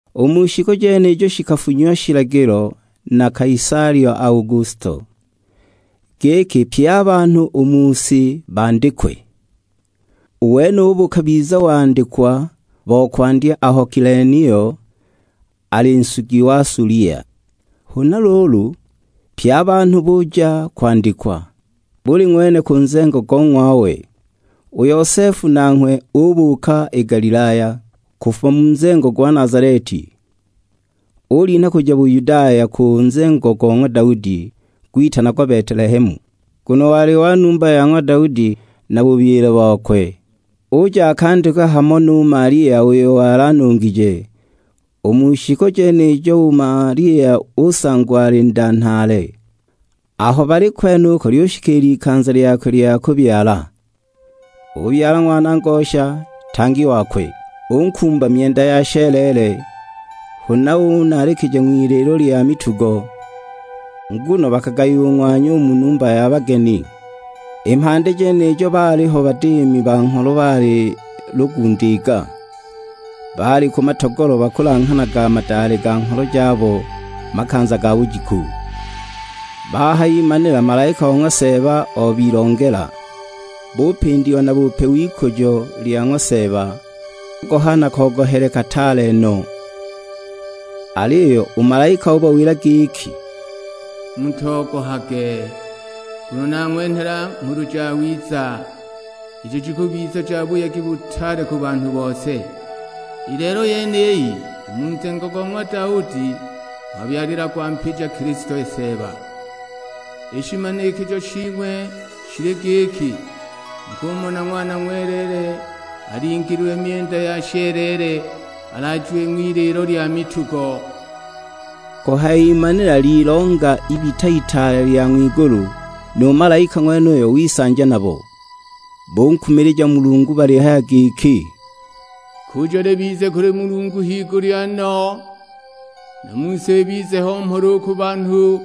U mu shiku jenijo shikafunyiwa shilagilo na Kaisali Augusto, giki pye a banhu u mu si bandikwe. U wenubo bukabiza wandikwa bo kwandya aho Kilenio ali nsugi wa Sulia. Huna luulu pye a banhu buja kwandikwa, buli ng'wene ku nzengo go ng'wawe. U Yosefu nanghwe ubuuka i Galilaya, kufuma mu nzengo gwa Nazaleti. Ulinha kuja Buyudaya ku nzengo go ng'wa Daudi, gwitanagwa Betelehemu, nguno wali wa numba ya ng'wa Daudi na bubyile bokwe. Uja akandikwe hamo nu Malia uyo wali anungije, u mu shiku jenijo u Malia usangwa ali nda nhaale. Aho bali kwenuko lyushikiila i likanza lyakwe lya kubyala. Ubyala ng'wana ngosha; tang@i wakwe. Unkumba myenda ya sheleele, huna unaalikija ng'wiliilo lya mitugo, nguno bakagayiwa u ng'wanya u mu numba ya bageni. I mhandi jenijo baaliho badiimi ba ngholo baali lugundiiga; baali ku matogolo bakulanghanaga madale ga ngholo jabo makanza ga bujiku. Bahayimanila malaika o ng'wa Seeba obilongela, bupindiwa na bupe w'ikujo lya ng'wa Seeba, bogoha na kogohele kataale no! Aliyo u malaika ubawila giki, "Mutogohage, nguno nang'wenhela Nghulu Jawiza, ijo jikubiza ja buyegi butaale ku banhu bose. I lelo yeniyi, u mu nzengo go ng'wa Daudi ng'wabyalilagwa Mpija, Kilisto Seeba. I shimanikijo shing'we shili giki, mukumona Ng'wana ng'weleele alingiililwe myenda ya sheleele, alaajiwe ng'wiliilo lya mitugo!" Kuhayimanila lilonga ibita itaale lya ng'wigulu, nu malaika ng'wenuyo wisanja nabo. Bunkumilija Mulungu balihaya giki, "Ikujo libize kuli Mulungu higulya no, nu mu si ibize ho mhola u ku banhu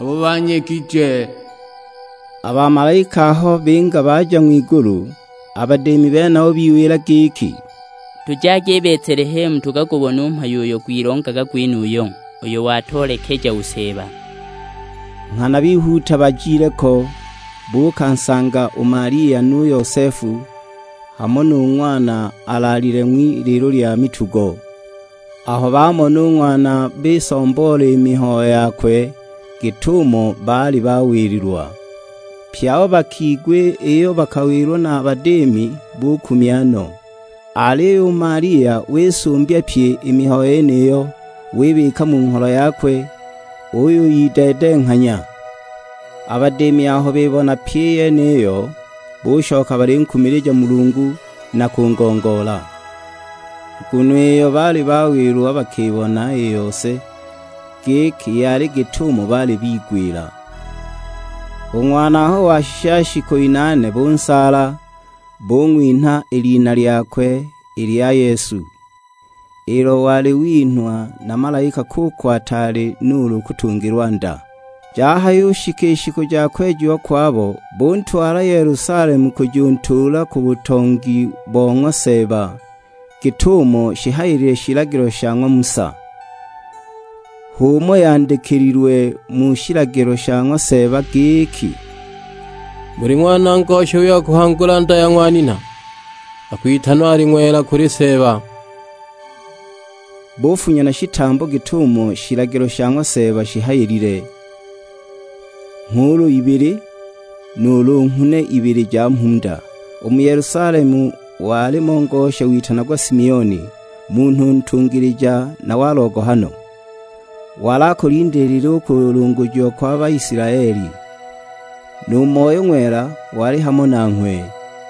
abo banyegije." A bamalaika aho binga baja ng'wigulu, a badiimi benabo biwila giki, "Tujagi i Betelehemu tukagubone u mhayo uyo gwilongaga gwenuyu, uyo watoolekeja u Seeba." Nghana bihuuta bajile ko, buukansanga u Malia nu Yosefu, hamo nu Ng'wana alaalile ng'wiliilo lya mitugo. Aho bamona u Ng'wana bisomboola i mihayo yakwe, git'umo baali bawililwa. Pye abo bakigwa iyo bakawilwa na a badiimi bukumya no. Aliyo u Malia wisumbya pyi i mihayo yeniyo, wibika mu ngholo yakwe, uyuyideedenghanya. A badiimi aho bibona pyi i yeniyo, bushoka balinkumilija Mulungu, na kungongoola. Nguno iyo baali bawilwa bakibona i yose, giki yali git'umo baali bigwila. U Ng'wana aho washisha shiku inaane bunsaala, bung'winha i lina lyakwe i lya Yesu, ilo wali winhwa na malaika kuko ataali nuulu kutungilwa nda. Jahayushika i shiku ja kwejiwa kwabo, buntwala Yelusalemu kujuntuula ku butongi bo ng'wa Seeba, git'umo shihayilile shilagilo sha ng'wa Musa. H'umo yandikililwe mu shilagilo sha ng'wa Seeba, giki, "Buli ng'wana ngosha u wa kuhangula nda ya ng'wa nina, akwitanwa ali ng'wela kuli Seeba." Bufunya na shitambo git'umo shilagilo sha ng'wa Seeba shihayilile: nghuulu ibili, nuulu nghune ibili ja mhunda. U mu Yelusalemu walimo ngosha witanagwa Simioni, munhu ntungilija na wa logohano. Wali akulindiilile u kulungujiwa kwa Baisilaeli; nu Moyo Ng'wela wali hamo nanghwe.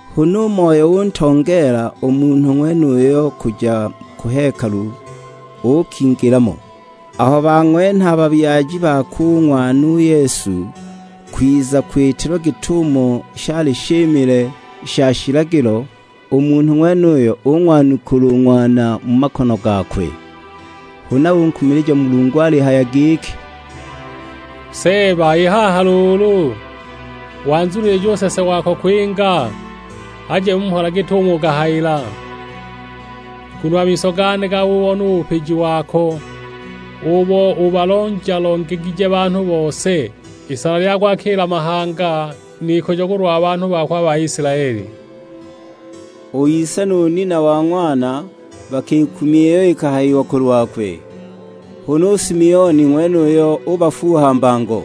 Huna u Moyo utongeela u munhu ng'wenuyo kuja ku hekalu, uukingila mo. Aho bang'wenha a babyaji bakwe u Ng'wana u Yesu, kwiza kwitilwa git'umo shali shimile sha shilagilo, u munhu ng'wenuyo ung'wanukula u Ng'wana mu makono gakwe. Huna unkumilija Mulungu alihaya giki, "Seeba, i haha luulu wanzunilija u nsese wako kwinga, aje mu mhola git'umo ukahayila. Nguno a miso gane gabubona u bupiji wako, ubo ubalonja-longegije banhu bose. Isana lya kwakila mahanga, n'ikujo kulwa banhu bako a Baisilaeli." U ise nu nina wa Ng'wana bakikumya iyo ikahayiwa kulwakwe. Huna u Simioni ng'wenuyo ubafuuha mbango.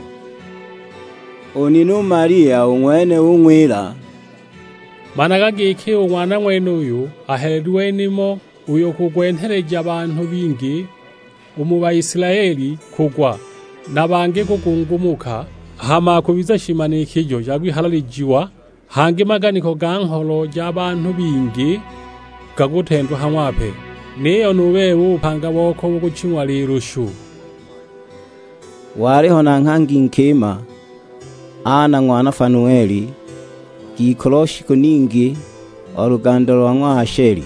U nina u Malia u ng'wene ung'wila, "Managa giki, u Ng'wana ng'wenuyu ahelelilwe nimo uyo gukwenheleja banhu bingi u mu Baisilaeli kugwa, na bangi kugungumuka; hama akubiza shimanikijo sha kwihalalijiwa. Hangi maganiko ga ngholo ja banhu bingi gakutendwa ha ng'wape; niyo nu bebe u bupanga boko bukuching'wa lilushu!" Waliho na nghangi nkima, Ana ng'wana Fanueli; ngikulu o shiku ningi, o luganda lo ng'wa Asheli.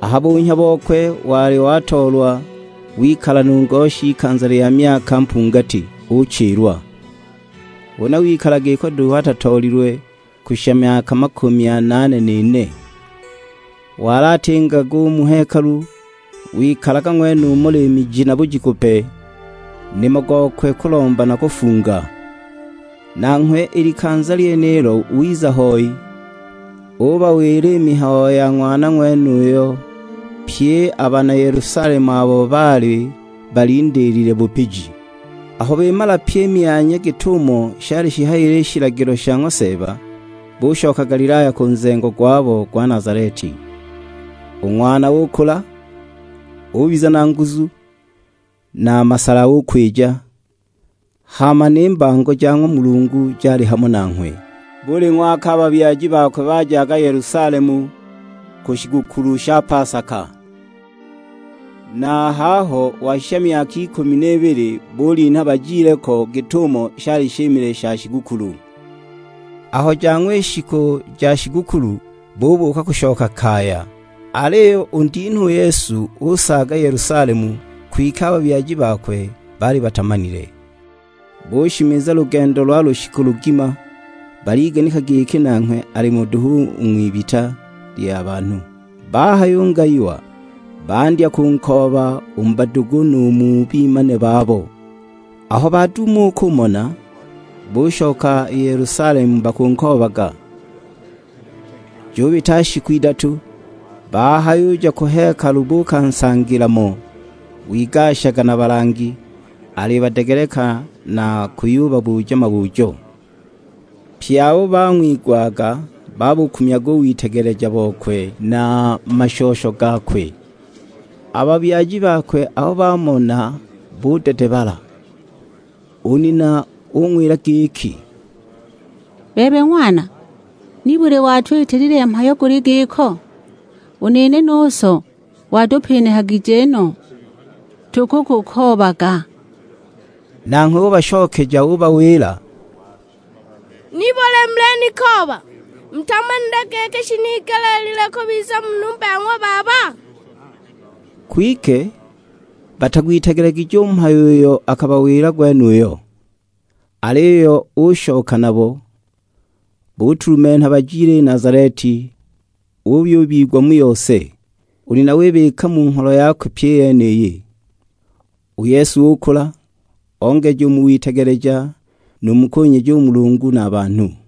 A ha bunhya bokwe wali watoolwa, wikala nu ngoshi ikanza lya myaka mpungati, uchilwa! Huna wikala giko duhu atatoolilwe, kushisha myaka makumi anaane n'ine. Wali atingaga u mu hekalu, wikalaga ng'wenumo liimi ji na bujiku pe; nimo gokwe kulomba na kufunga. Nanghwe i likanza lyenilo wiza hoi, ubawila i mihayo ya Ng'wana ng'wenuyo, pye a bana Yelusalemu abo baali balindiilile bupiji. Aho bimala pyi i myanya git'umo shali shihayilile i shilagilo sha ng'wa Seeba, bushoka Galilaya ku nzengo gwabo gwa Nazaleti. U Ng'wana ukula, ubiza na nguzu, na a masala ukwija, hama ni mbango ja ng'wa Mulungu jali hamo nanghwe. Buli ng'waka a babyaji bakwe bajaga Yelusalemu, ku shigukulu sha pasaka. Na a haho washisha myaka ikumi n'ibili, bulinha bajile ko git'umo shali shimile sha shigukulu. Aho jang'wa i shiku ja shigukulu, bubuuka kushoka kaya. Aliyo u ndinha u Yesu usaaga Yelusalemu, kwike a babyaji bakwe baali batamanile. Bushimiza lugendo lwa lushiku lugima, baliganika giki nanghwe alimo duhu u ng'wibita lya banhu. Bahayungayiwa, bandya kunkooba u mu badugu nu mu bimane babo. Aho baduuma u kumona, bushoka i Yelusalemu bakunkoobaga. Jubita shiku idatu, bahayuja ku hekalu buukansangila mo, wigashaga na balangi, alibadegeleka na kuyubabuja mabujo. Pye abo bang'wigwaga babukumyaga u witegeleja bokwe, na a mashosho gakwe. A babyaji bakwe aho bamona budedebala! U nina ung'wila giki, "Bebe Ng'wana, nibuli watwitilile mhayo guli giko? U nene nu so watupinihagije no, tukukukoobaga!" Nanghwe ubashokeja ubawila, "Nibuli mulinikooba? Mutamanile giki shinigeleelilwe kubiza mu numba ya ng'wa Baba?" Kwike batagwitegelegije u mhayo uyo akabawila gwenuyo. Aliyo ushoka nabo, butulumenha bajile i Nazaleti, uyubigwa mu yose. U nina wibika mu ngholo yakwe pyi i yeniyi. U Yesu ukula, ongeja u mu witegeleja, nu mu kunyeja u Mulungu, na a banhu.